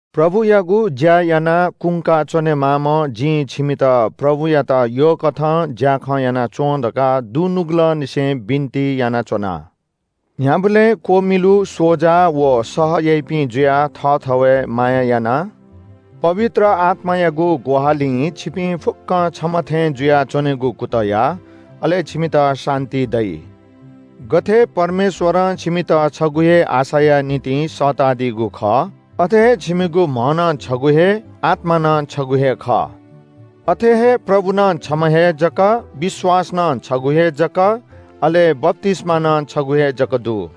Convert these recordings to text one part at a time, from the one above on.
प्रभुयागु ज्‍या यानाः कुंका च्‍वनेमाःम्‍ह जिं छिमित प्रभुयात यःकथं ज्‍याखँ याना च्‍वँ धकाः दुनुगलंनिसें बिन्‍ति यानाच्‍वना। न्‍ह्याबलें क्‍वमिलु, स्‍वजा व सह याइपिं जुयाः थःथवय् माया यानाः पवित्र आत्‍मायागु ग्‍वाहालिं छिपिं फुक्‍कं छम्‍ह थें जुयाच्‍वनेगु कुतः या। अले छिमित शान्‍ति दइ। गथे परमेश्‍वरं छिमित छगू हे आशाया निंतिं सःतादीगु खः, अथे हे छिमिगु म्‍ह नं छगू हे, आत्‍मा नं छगू हे खः। अथे हे प्रभु नं छम्‍ह हे जक, विश्‍वास नं छगू हे जक, अले बप्‍तिस्‍मा नं छगू हे जक दु।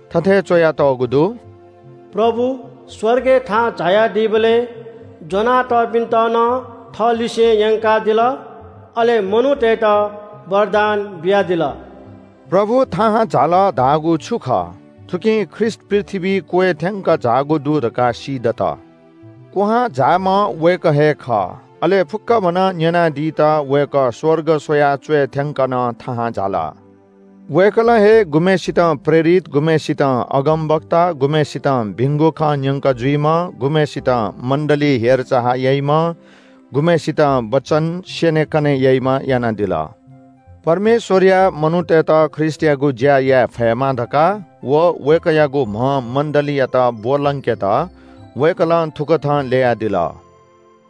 थथे च्‍वयातःगु दु – “प्रभु स्‍वर्गय् थाहां झायादीबलय् ज्‍वनातःपिन्‍त नं थःलिसें यंकादिल। अले मनूतय्‌त वरदान बियादिल।” प्रभु थाहां झाल धाःगु छु खः? थुकिं ख्रीष्‍ट पृथ्‍वीइ क्‍वय् थ्‍यंक झाःगु दु धकाः सीदत। क्‍वहां झाःम्‍ह वय्‌कः हे खः। अले फुक्‍कभनं न्‍यनादीत वय्‌कः स्‍वर्ग स्‍वयाः च्‍वय् थ्‍यंक नं थाहां झाल। वय्‌कलं हे गुम्‍हय्‌सितं प्रेरित, गुम्‍हय्‌सितं अगमवक्ता, गुम्‍हय्‌सितं भिंगु खँ न्‍यंक जुइम्‍ह, गुम्‍हय्‌सितं मण्‍डलीइ हेरचाह याइम्‍ह, गुम्‍हय्‌सितं वचन स्‍यनेकने याइम्‍ह यानादिल। परमेश्‍वरया मनूतय्‌त ख्रीष्‍टयागु ज्‍या याये फयेमा धकाः व वय्‌कःयागु म्‍ह मण्‍डलीयात ब्‍वलंकेत वय्‌कलं थुकथं ल्‍ययादिल।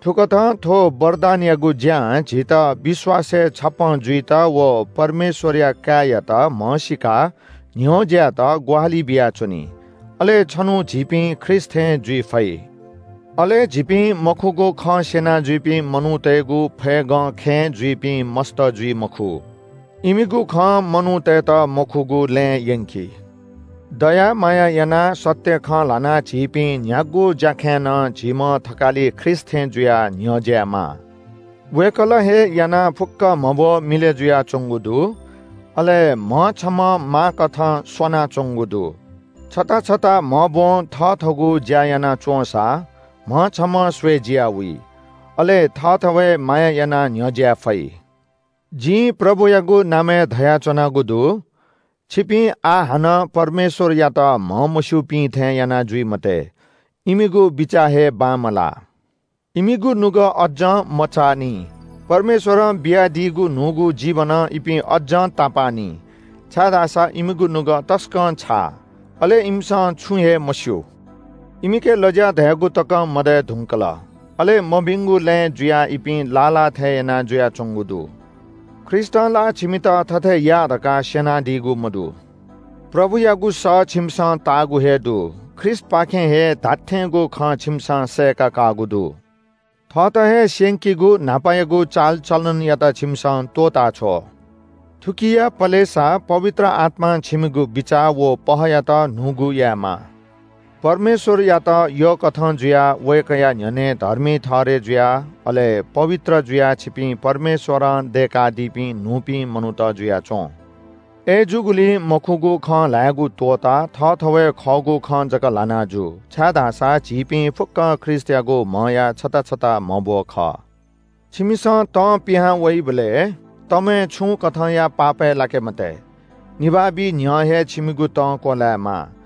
थुकथं थ्‍व वरदानयागु ज्‍यां झीत विश्‍वासय् छप्‍पँ जुइत व परमेश्‍वरया काय्‌यात म्‍हसीकाः न्‍ह्यज्‍यायेत ग्‍वाहालि बियाच्‍वनी। अले छन्‍हु झीपिं सिद्ध मनू जुयाः ख्रीष्‍ट थें जुइ फइ। अले झीपिं मखुगु खँ स्‍यना जुइपिं मनूतय्‌गु फय्‌गं खँय् जुइपिं मस्‍त जुइ मखु। इमिगु खं मनूतय्‌त मखुगु लँय् यंकी। दया माया यानाः सत्‍य खँ ल्‍हानाः झीपिं न्‍ह्यागु ज्‍याखँय् नं झीम्‍ह थकालि ख्रीष्‍ट थें जुयाः न्‍ह्यज्‍यायेमाः। वय्‌कलं हे यानाः फुक्‍क म्‍हब्‍व मिलय् जुयाच्‍वंगु दु, अले म्‍ह छम्‍हं माःकथं स्‍वानाच्‍वंगु दु। छता छता म्‍हब्‍वं थथःगु ज्‍या याना च्‍वंसा म्‍ह छम्‍हं स्‍वय् जिया वइ, अले थःथवय् माया यानाः न्‍ह्यज्‍याये फइ। जिं प्रभुयागु नामय् धयाच्‍वनागु दु – छिपिं आः हानं परमेश्‍वरयात म्‍हमस्‍यूपिं थें याना जुइ मते। इमिगु बिचाः हे बांमलाः। इमिगु नुगः अज्‍जं मचाःनि। परमेश्‍वरं बियादीगु न्‍हूगु जीवनं इपिं अज्‍जं तापाः नि, छाय्‌धाःसा इमिगु नुगः तसकं छाः, अले इमिसं छुं हे मस्‍यू। इमिके लज्‍या धयागु तकं मदये धुंकल। अले मभिंगु लँय् जुयाः इपिं लाः लाः थे याना जुयाच्‍वंगु दु। ख्रीष्‍टं ला छिमित थथे या धकाः स्‍यनादीगु मदु। प्रभुयागु सः छिमिसं ताःगु हे दु। ख्रीष्‍टपाखें हे धात्‍थेंगु खँ छिमिसं सय्‌का काःगु दु। थःत हे स्‍यंकीगु न्‍हापायागु चालचलनयात छिमिसं त्‍वःताछ्व। थुकिया पलेसा पवित्र आत्‍मां छिमिगु बिचाः व पहःयात न्‍हूगु यायेमा। परमेश्‍वरयात यःकथं जुयाः वय्‌कःया न्‍ह्यःने धर्मी ठहरय् जुयाः अले पवित्र जुयाः छिपिं परमेश्‍वरं दय्‌कादीपिं न्‍हूपिं मनूत जुयाच्‍वँ। अय्‌जूगुलिं मखुगु खँ ल्‍हायेगु त्‍वःताः थःथवय् खःगु खँ जक ल्‍हाना जु, छाय्‌धाःसा झीपिं फुक्‍कं ख्रीष्‍टयागु म्‍हया छता छता म्‍हब्‍व खः। छिमिसं तं पिहां वइबलय् तमय् छुं कथंया पाप याये मते। निभाः बी न्‍ह्यः हे छिमिगु तं क्‍वलायेमाः!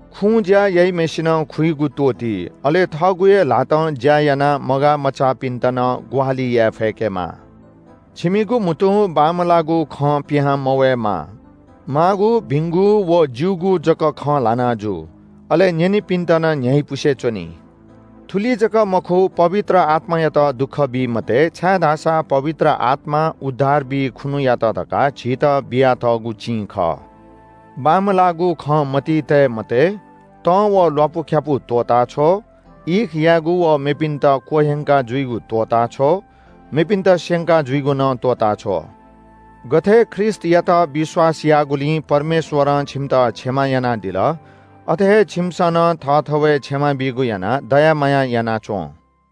खुँज्‍या याइम्‍हय्‌सिनं खुइगु त्‍वःति। अले थःगु हे ल्‍हातं ज्‍या यानाः मगाःमचाःपिन्‍त नं ग्‍वाहालि याये फय्‌केमाः। छिमिगु म्‍हुतुं बांमलाःगु खँ पिहां मवयेमा। माःगु, भिंगु व ज्‍यूगु जक खँ ल्‍हाना जु। अले न्‍यनीपिन्‍त नं न्‍ह्याइपुसे च्‍वनी। थुलि जक मखु, पवित्र आत्‍मायात दुःख बी मते, छाय्‌धाःसा पवित्र आत्‍मा उद्धार बी खुन्‍हुयात धकाः झीत बियातःगु चिं खः। बांमलाःगु खँ मतिइ तये मते, तं व ल्‍वापुख्‍यापु त्‍वःताछ्व। ईख यायेगु व मेपिन्‍त क्‍वह्यंका जुइगु त्‍वःताछ्व। मेपिन्‍त स्‍यंका जुइगु नं त्‍वःताछ्व। गथे ख्रीष्‍टयात विश्‍वास याःगुलिं परमेश्‍वरं छिमित क्षमा यानादिल, अथे हे छिमिसं नं थःथवय् क्षमा बीगु यानाः दया माया याना च्‍वँ।